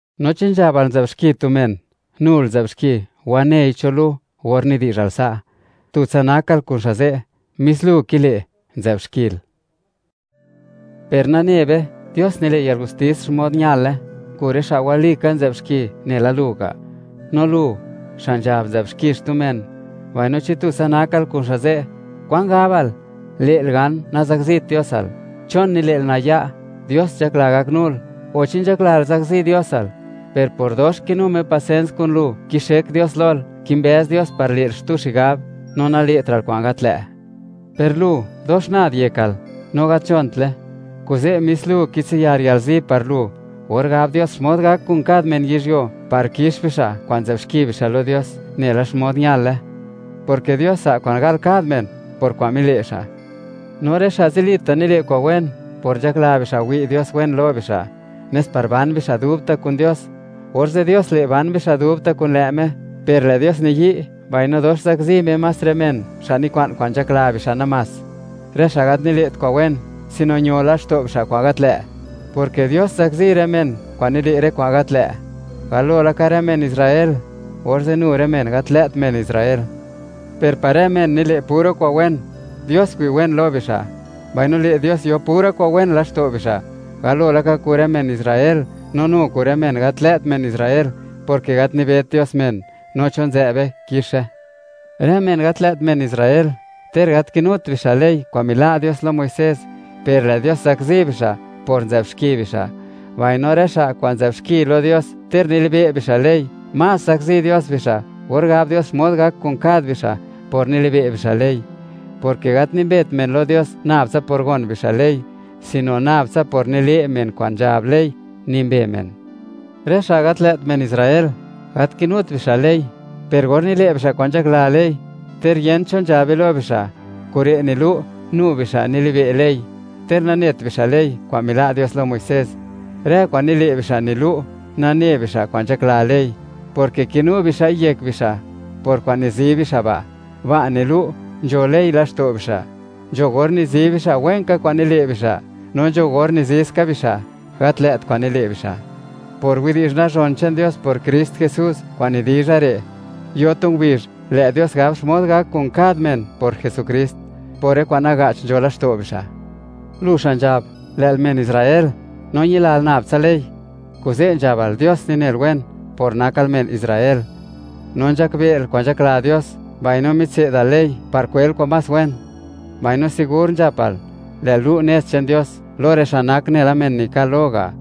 No chi nzhabal, nzë'b xki tu men, nul nzë'b xki, wanei cho lu. Or nidi'zhal sa', tutsa nakal kun xa' ze', mis lu kile', nzë'b xkil. Per nane be, Dios nile' yalgustis xmod ñale kun rë xa' walika nzë'b xki, nela lu ga'. No lu, xa' nzhab nzë'b xki xtu men, mbaino chi tutsa nakal kun xa' ze', ¿kwan gabal, le'l gan, nazakzit Diosal? ¿Chon nile'l naya'? Dios nzhakla gaknul, o, ¿chi nzhaklal zakzi Diosal? Per por dox kinu Me pasens kun lu, kixek Dios lol, kimbëz Dios par le'l xtu xigab, no nale'tra'l kwa'n gat lë'. Per lu dox nad yekal, no gat nzhontle. Kuze' mis lu kitsiyar yalzi par lu, or gab Dios xmod gak kun kad men yizhyuo, par kix bixa' kwa'n nzë'b xki bixa' lo Dios nela xmod ñale, porke Dios za' kwa'n gal kad men, por kwa'n mile' xa'. No rë xa' zilita' nile' kwa'n wen, por nzhakla bixa' wi' Dios wen lo bixa', nes par ban bixa' dubta' kun Dios; orze' Dios le', ban bixa' dubta' kun lë' Me. Per lë' Dios niyi' mbaino dox zakzi Me más rë men, xa' nikwa'n kwa'n nzhakla bixa' namás, rë xa' gat nile't kwa'n wen, sino ño laxto' bixa' kwa'n gat lë', porke Dios zakzi rë men kwa'n nile' rë kwa'n gat lë', galo laka rë men Israel, orze' nu rë men gat lë't men Israel. Per par rë men nile' pura kwa'n wen, Dios wi' wen lo bixa', mbaino le' Dios yo pura kwa'n wen laxto' bixa', galo laka kun rë men Israel, no nu kun rë men gat lë't men Israel, porke gat nibet Dios men, no cho nzë'be kixe. Rë men gat lë't men Israel, ter gat kinut bixa' ley kwa'n mila' Dios lo Muisés, per lë' Dios zakzi bixa' por nzë'b xki bixa'; mbaino rë xa' kwa'n nzë'b xki lo Dios ter nilibe' bixa' ley, más zakzi Dios bixa' or gab Dios xmod gak kun kad bixa' por nilibe' bixa' ley, porke gat nimbet men lo Dios nab por gon bixa' ley, sino nab tsa por nile' men kwa'n nzhab ley, nimbe men. Rë xa' gat lë't men Israel, gat kinut bixa' ley, per or nile' bixa' kwa'n nzhakla ley, ter yent cho nzhabe lo bixa', kure' nilu', nu bixa' nilibe' ley, ter nanet bixa' ley kwa'n mila' Dios lo Muisés. Rë kwa'n nile' bixa' nilu', nane bixa' kwan nzhakla ley, porke kinu bixa'i yek bixa' por kwa'n nizi bixa' ba', ba' nilu' nzho ley laxto' bixa'. Nzho or nizi bixa' wen ka kwa'n nile' bixa', no nzho or nizi ska bixa', gat lë't kwa'n nile' bixa'. Por widi'zh nazhon che'n Dios por Krist Jesús kwa'n nidizha re', yo tu ngubizh, lë' Dios gab xmod gak kun kad men por Jesukrist, por rë kwa'n naga'ch nzho laxto' bixa'. Lu xa' nzhab, lë'l men Israel no ñilal nab tsa ley, kuze' nzhabal, Dios ninel wen por nakal men Israel, no nzhakbe'l kwan nzhakla Dios, mbaino mitse'dal ley par kwel kwa'n más wen, mbaino sigur nzhapal, lë'l lu' nez che'n Dios lo rë xa' nak nela men nikal lo ga',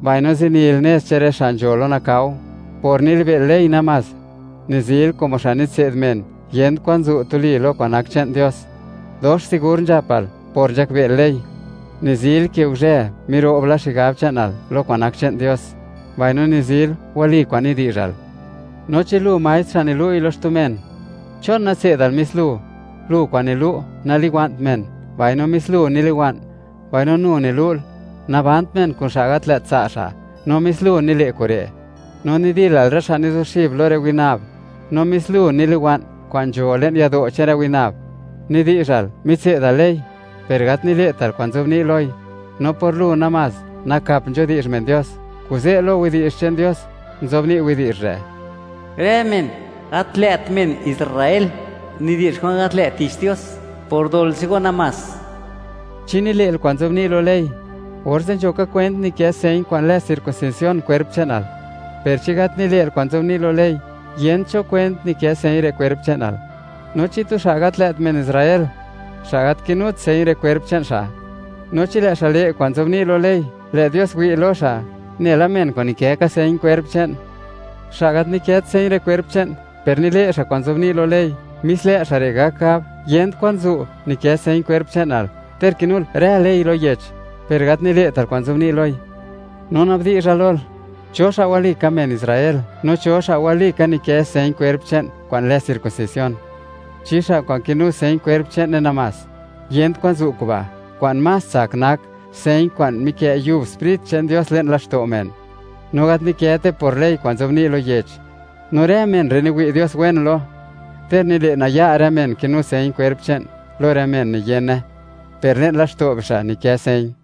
mbaino zinil nez che'n rë xa' nzho lo nakao. Namás por nilibe'l ley, nizil nela tu xa' nilu' ley lo men yent kwan zu' tuli lo kwa'n nak che'n Dios. Dox sigur nzhapal, por nzhakbe'l ley, nizil ke guzhë, miro'b la xigab che'nal lo kwa'n nak che'n Dios, mbaino nizil, wali kwa'n nidi'zhal. No chi lu maestr, xa' nilu'i lo men, ¿chon natse'dal mis lu? Lu kwa'n nilu': “Naliwa'nt men”, mbaino mis lu niliwa'n. Mbaino nu nilu'l: “Nabant men kun xa' gat lë't tsa' xa'”, no mis lu nile' kure'. No nidilal rë xa' nizuxib lo rë winab, no mis lu niliwa'n kwa'n nzho le'n yado' che'n rë winab. Nidi'zhal, mitse'dal ley, per gat nile'tal kwa'n nzobni' loi, no por lu namás nakap nzhudi'zh men Dios. Kuze' lo widi'zh che'n Dios nzobni' widi'zh re': “Rë men gat lë't men Israel nidi'zh kwa'n gat lë' tich Dios por dol che'n go namás.” Chi nile'l kwa'n nzobni' lo ley, orze' nzho ka kwent nikë señ kwa'n lë circuncisión kwerp che'nal; per chi gat nile'l kwa'n nzobni' lo ley, yent cho kwent nikë señ re' kwerp che'nal. No chi tu xa' gat lë't men Israel, xa' gat kinut señ re' kwerp che'n xa', no chi lë' xa' le' kwa'n nzobni' lo ley, lë' Dios wi' lo xa' nela men kwa'n nikë ka señ kwerp che'n. Xa' gat nikët señ re' kwerp che'n, per nile' xa' kwa'n nzobni' lo ley, mis lë' xa' re' gak gab, yent kwan zu' nikë señ kwerp che'nal, ter kinul rë ley lo yech per gat nile'tal kwa'n nzobni' loi. No na'bdi'zha lol, ¿cho xa' walika men Israel, no cho xa' walika nikë señ kwerp che'n kwa'n lë circuncisión? ¿Chi xa' kwa'n kinu señ kwerp che'ne namás? Yent kwan zu' kuba'; kwa'n más tsak nak, señ kwa'n mikë' yub Sprit che'n Dios le'n laxto' men, no gat nikëte por ley kwa'n nzobni' lo yech, no rë men re' niwi' Dios wen lo, ter nile' naya' rë men kinu señ kwerp che'n lo rë men niyene per le'n laxto' bixa' nikë señ.